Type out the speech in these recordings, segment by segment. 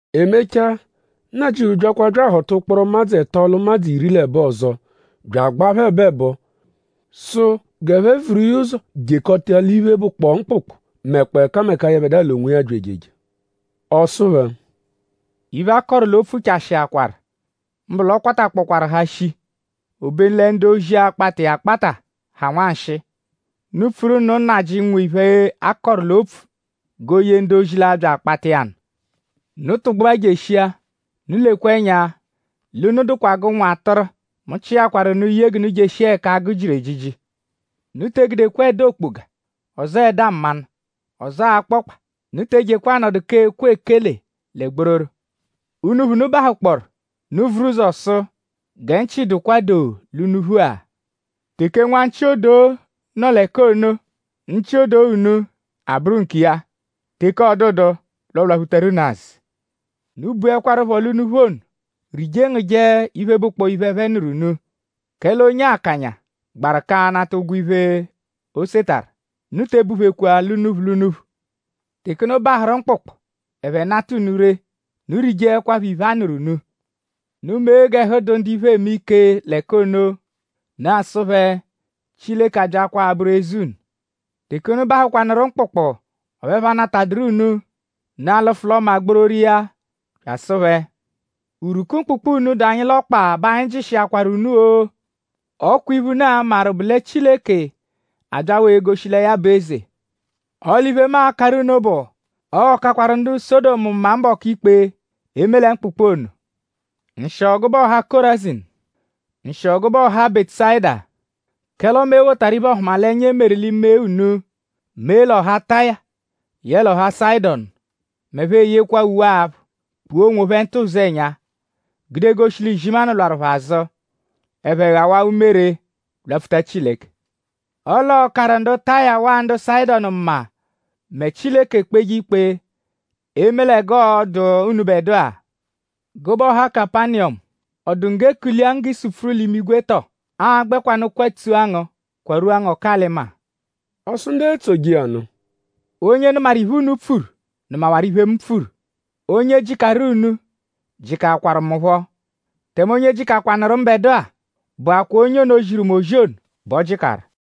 E mechaa; Nnajịuphu byakwa bya ahọta ụkporo ụmadzu ẹto l'ụmadzu iri l'ẹbo ọzo bya agbaa phẹ ẹbo-ẹbo; sụ g'ẹphe vuru iya ụzo jekọta l'iphe, bụkpoo mkpụkpu mẹkpoo ẹkameka, yẹbedua l'onwiya abya ejeje. Ọ sụ phẹ: “Iphe, a kọru l'opfu chashịakwaru; mbụ l'ọ kwatakpọkwaaru ha shii; obenu lẹ ndu-ozi, akpata iya akpata ha nwanshịi. Unu pfuru nụ Nnajị, nwe iphe, a kọru l'opfu g'o ye ndu-ozi, l'a-bya akpata iya nụ. Unu tụgbua jeshia. Unu lekwa ẹnya: l'unu dụkwa g'ụnwu atụru; mu chịakwaru unu ye g'unu jeshia ẹka agụ jiru ejiji. Unu te egudekwa ẹda-okpoga; ọzoo ẹda mmanụ; ọzoo akpọkpa. Unu te ejekwa anọdu k'ekwe ekele lẹ gbororo. Unuphu, unu -bahụkpooru; unu vuru ụzo sụ: ‘Gẹ nchị dụkwa doo l'unuphu-a.’ Teke nwa nchị-odoo nọ l'ẹka ono; nchị-odoo unu abụru nkiya. Teke 'ọ dụdu; l'ọ lwaphutaru unu azụ. Unu buẹkwarupho l'unuphu ono; rije ngụje iphe, bụkpoo iphe, ẹphe nụru unu; kẹle onye akanya gbaru k'anata ụgwo iphe, o setarụ. Unu te ebuphekwa l'unuphu l'unuphu. Teke unu bahụru mkpụkpu; ẹphe -nata unu ree; unu rijeẹkwapho iphe, a nụru unu. Unu mee g'ẹhu dụ ndu iphe eme ike l'ẹka ono; unu asụ phẹ: ‘Chileke abyaakwaa abụru eze unu.’ Teke unu bahụkwanuru mkpụkpu; ọphu ẹphe anatadụru unu; unu alụfu l'ọma gbororo iya bya asụ phẹ: ‘Urwuku mkpụkpu unu, dụ anyi l'ọkpa bẹ anyi jịshiakwaru unu-o! Ọ kwa iphe, unu a-maru bụ lẹ Chileke abyawaa egoshi lẹ ya bụ eze.’ Ọle iphe, mu akarụ unu bụ; ọo-kakwaru ndu Sọdomu mma mbọku ikpe; eme lẹ mkpụkpu ono.” “Nshịo gụbe ọha Kọrazinu! Nshịo gụbe ọha Bẹtusayida! Kẹle ọme e wotaru iphe-ọhumalenya, e meru l'ime unu mee l'ọha Taya yẹle ọha Sayịdonu m'ẹphe eyekwaa uwe-aphụ; kpua onwophẹ ntụ ụzenya; gude goshi l'izimanụ lwarụ phẹ azụ; ẹphe ghawaa umere lwapfuta Chileke. Ọle ọo-karụ ndu Taya waa ndu Sayịdonu mma mẹ Chileke kpeje ikpe eme lẹ g'ọo-dụ unubẹdua. Gụbe ọha Kapaniyọmu!?Ọ dụ ngu g'e kulia ngu g'i supfuru l'imigwe tọ? Aa-gbẹkwanu kwatsua ngu kwarua ngu ọku-alị-maa!” Ọ sụ ndu etsoje iya nụ: “Onye nụmaru iphe, unu pfuru nụmawaru iphe, mu pfuru; onye jịkaru unu jịkakwaru mu phọ; tẹme onye jịkakwanuru mbẹdua bụakwaa onye ono, ziru mu ozi ono bẹ o jịkaru.”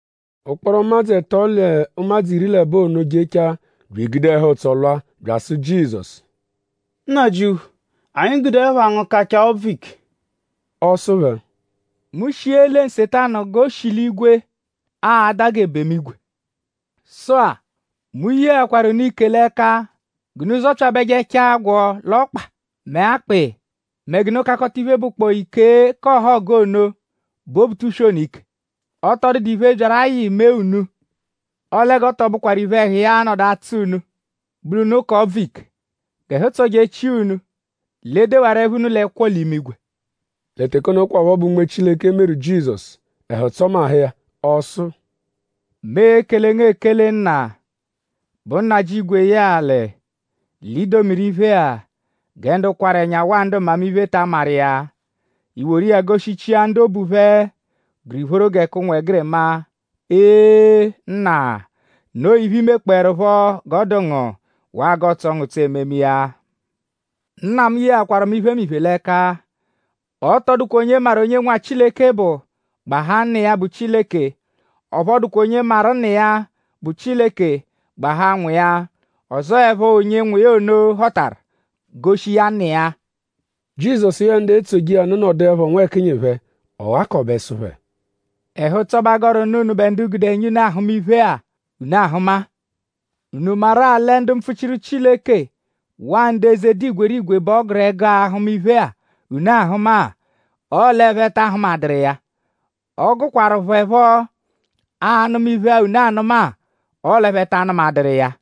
Ụkporo ụmadzu ẹto l'ụmadzu iri l'ẹbo ono jechaa bya egude ẹhu-ụtso lwa bya asụ Jizọsu: “Nnajịuphu; anyi gude ẹpha ngu kachaa ọbvu ike!” Ọ sụ phẹ: “Mu shia ele Nsetanu g'o shi l'igwe ada g'ebemu-igwe. Sụ-a; mu yeakwaru unu ike l'ẹka g'unu zọpyabejechaa agwọ l'ọkpa mẹ akpị mẹ g'unu kakọta iphe, bụkpoo ike k'ọhogu ono, bụ Obutuswe ike. Ọ tọ dụdu iphe, byaru ayị mee unu. Ọle g'ọ tọ bụkwaru iphe, ẹhu iya a-nọdu atsọ unu bụ l'unu ka ọbvu ike; g'ẹhu tsọjechia unu l'e dewaru ẹpha unu l'ẹkwo l'imigwe.” Lẹ teke ono kwaphọ bẹ Unme Chileke meru Jizọsu; ẹhu tsọmahu iya. Ọ sụ: “Mu ekele ngu ekele Nna, bụ Nnajị igwe yẹe alị; l'i domiru iphe-a gẹ ndu kwarụ ẹnya; waa ndu mmamiphe ta amaru iya; i woru iya goshichia ndu obu phẹ gụru ìphóró gẹ k'ụnwegirima. Ee! Nna; noo iphe, i mekpọerupho g'ọ dụ ngu; waa g'ọotso ngu ụtso ememe iya. “Nna mu yeakwaru mu iphemiphe l'ẹka. Ọ tọ dụkwa onye maru onye Nwa Chileke bụ; gbahaa Nna iya, bụ Chileke. Ọphu ọ dụkwa onye maru Nna iya, bụ Chileke; gbahaa Nwa iya; ọzo 'ẹpho onye Nwa iya ono họtaru; goshi iya Nna iya.” Jizọsu yẹe ndu etsoje iya nụ nọduepho nwẹkinyi phẹ; ọ ghakọbe sụ phẹ: “Ẹhu-ụtso bẹ a gọru nụ unubẹ ndu gude ẹnya unu ahụma iphe-a, unu ahụma-a. ?Unu maru-a lẹ ndu mpfuchiru Chileke; waa ndu eze, dụ igwerigwe bẹ ọ gụru ẹgu ahụma iphe-a, unu ahụma-a; ọle ẹphe ta ahụmaduru iya. Ọ gụkwaru phẹ phọ anụma iphe-a, unu anụ-a; ọle ẹphe ta anụmaduru iya.”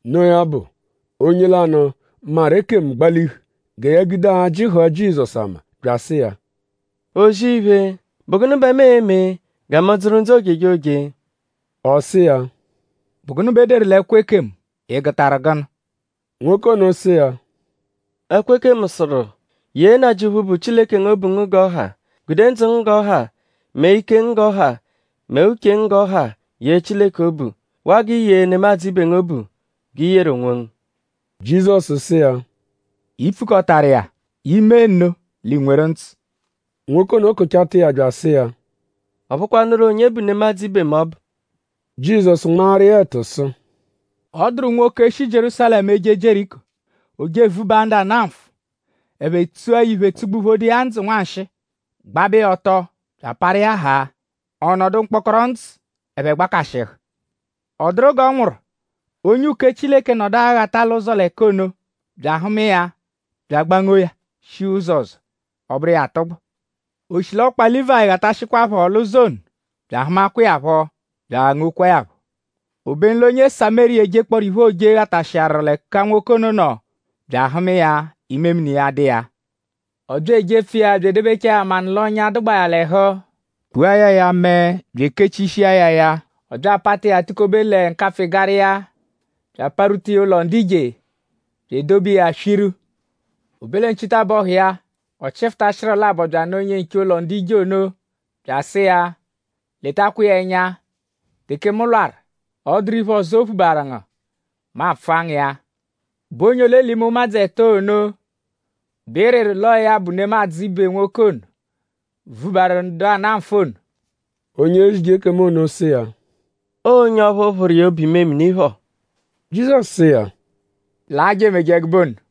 Noo ya bụ; onye lanụ, maru ekemu gbalihu gẹ ya gude ajị hụa Jizọsu ama bya asụ iya: “O-zì-iphe;?bụ gụnu bẹ mu e-me gẹ mu dzụru ndzụ ojejoje.” Ọ sụ iya: “?Bụ gụnu bẹ e deru l'ẹkwo ekemu??Ị gụtaru gụnu?” Nwoke ono sụ iya: “Ẹkwo ekemu sụru: ‘Yee Nnajịuphu, bụ Chileke ngu obu ngu g'ọ ha. Gude ndzụ ngu g'ọ ha; mẹ ike ngu g'ọ ha; mẹ uche ngu g'ọ ha yee Chileke obu. Waa g'i yee nemadzụ ibe ngu obu g'i yeru onwongu.’” Jizọsu sụ iya: “I pfukọtaru iya; i -mee nno; l'iinweru ndzụ.” Nwoke ono kụchata iya bya asụ iya: “?Ọ bụkwanuru onye bụ nemadzụ ibe mu ọbu?” Jizọsu nmaaru iya ẹtu sụ: “Ọ dụru nwoke, shi Jierúsalẹmu eje Jieriko. O je evubaa ndu ana nfụ. Ẹphe tsua ya iphe tsugbuphodo iya ndzụ nwanshịi; gbabẹ iya ọto bya aparu iya haa; ọ nọduwaa mkpọkpo ndzụ. Ẹphe gbakashịhu. Ọ dụru g'ọ nwụru; onye uke Chileke nọdu aghata l'ụzo l'ẹka ono bya ahụma iya; bya agbangoo ya; shia ụzo ọzo; ọ bụru iya atụgbu. Oshilọkpa Lívayi ghatashịkwaapho l'ụzo ono bya ahụmakwa iya phọ bya aghangokwaa ya phọ. Obenu l'onye Samériya, ejekpọoro iphe, ooje ghatashịaru ẹka nwoke ono nọ bya ahụma iya; imemini iya dụ iya. Ọ bya ejepfu iya bya edebechaa ya manụ l'ọ́nyá, dụgbaa ya l'ẹhu; kpua ya ya mẹe bya ekechishia ya ya. Ọ bya apata iya tukobe lẹ nkapfụ-ịgara iya; bya aparwuta iya ụlo ndu ije; bya edobe iya swiru. O be lẹ nchitabọhu iya; ọ chịfuta shịru labọ bya anụ onye-nche ụlo ndu ije ono bya asụ iya: ‘Letakwa iya ẹnya. Teke mu lwarụ; ọ -dụru iphe ọzo, o phubaaru ngu; mu a-pfụa ngu iya.’ “?Bụ onye ole l'ime ụmadzu ẹto ono bẹ ị rịru l'ọo ya bụ nemadzụ ibe nwoke ono, vubaru ndu ana nfụ ono?” Onye ezije ekemu ono sụ iya: “Ọo onye ọphu phụru iya obu-imemini phọ.” Jizọsu sụ iya: “Laa; je emeje ẹgube ono.”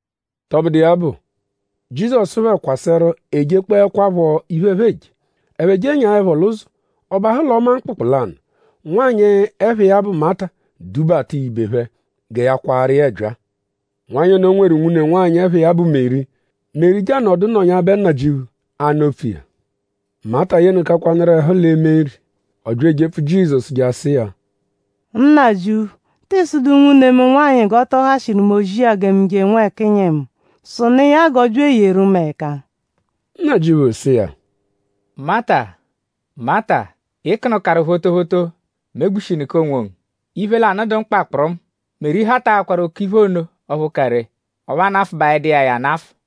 Tọbudu iya bụ; Jizọsu phẹ kwasẹru ejekpọekwapho iphe, ẹphe eje. Ẹphe jenyaẹpho l'ụzo; ọ bahụ l'ọma mkpụkpu lanụ. Nwanyị, ẹpha iya bụ Mata dubata iya ibe phẹ; gẹ ya kwaaru iya ẹbyaa. Nwanyị ono nweru nwune nwanyị, ẹpha iya bụ Meri. Meri je anọdu nọnyabe Nnajịuphu; anụ opfu iya. Mata yenụkakwanuru ẹhu l'eme nri. Ọ bya ejepfu Jizọsu je asụ iya: “Nnajịuphu!?Tịi sụdu nwune mu nwanyị g'ọ tọ hashịru mu ozi-a gẹ mu je nwẹkinyi mu? Sụnu iya g'ọ bya eyeru mu ẹka!” Nnajịuphu sụ iya: “Mata! Mata! Ị kụnukaru photophoto megbushinụka onwongu. Iphe lanụ bụ iphe, dụ mkpa kpụrumu. Meri hataakwanaru òkè-iphe ono ọphu ka ree. Ọphu a nafụbaedu iya ya anafụ.”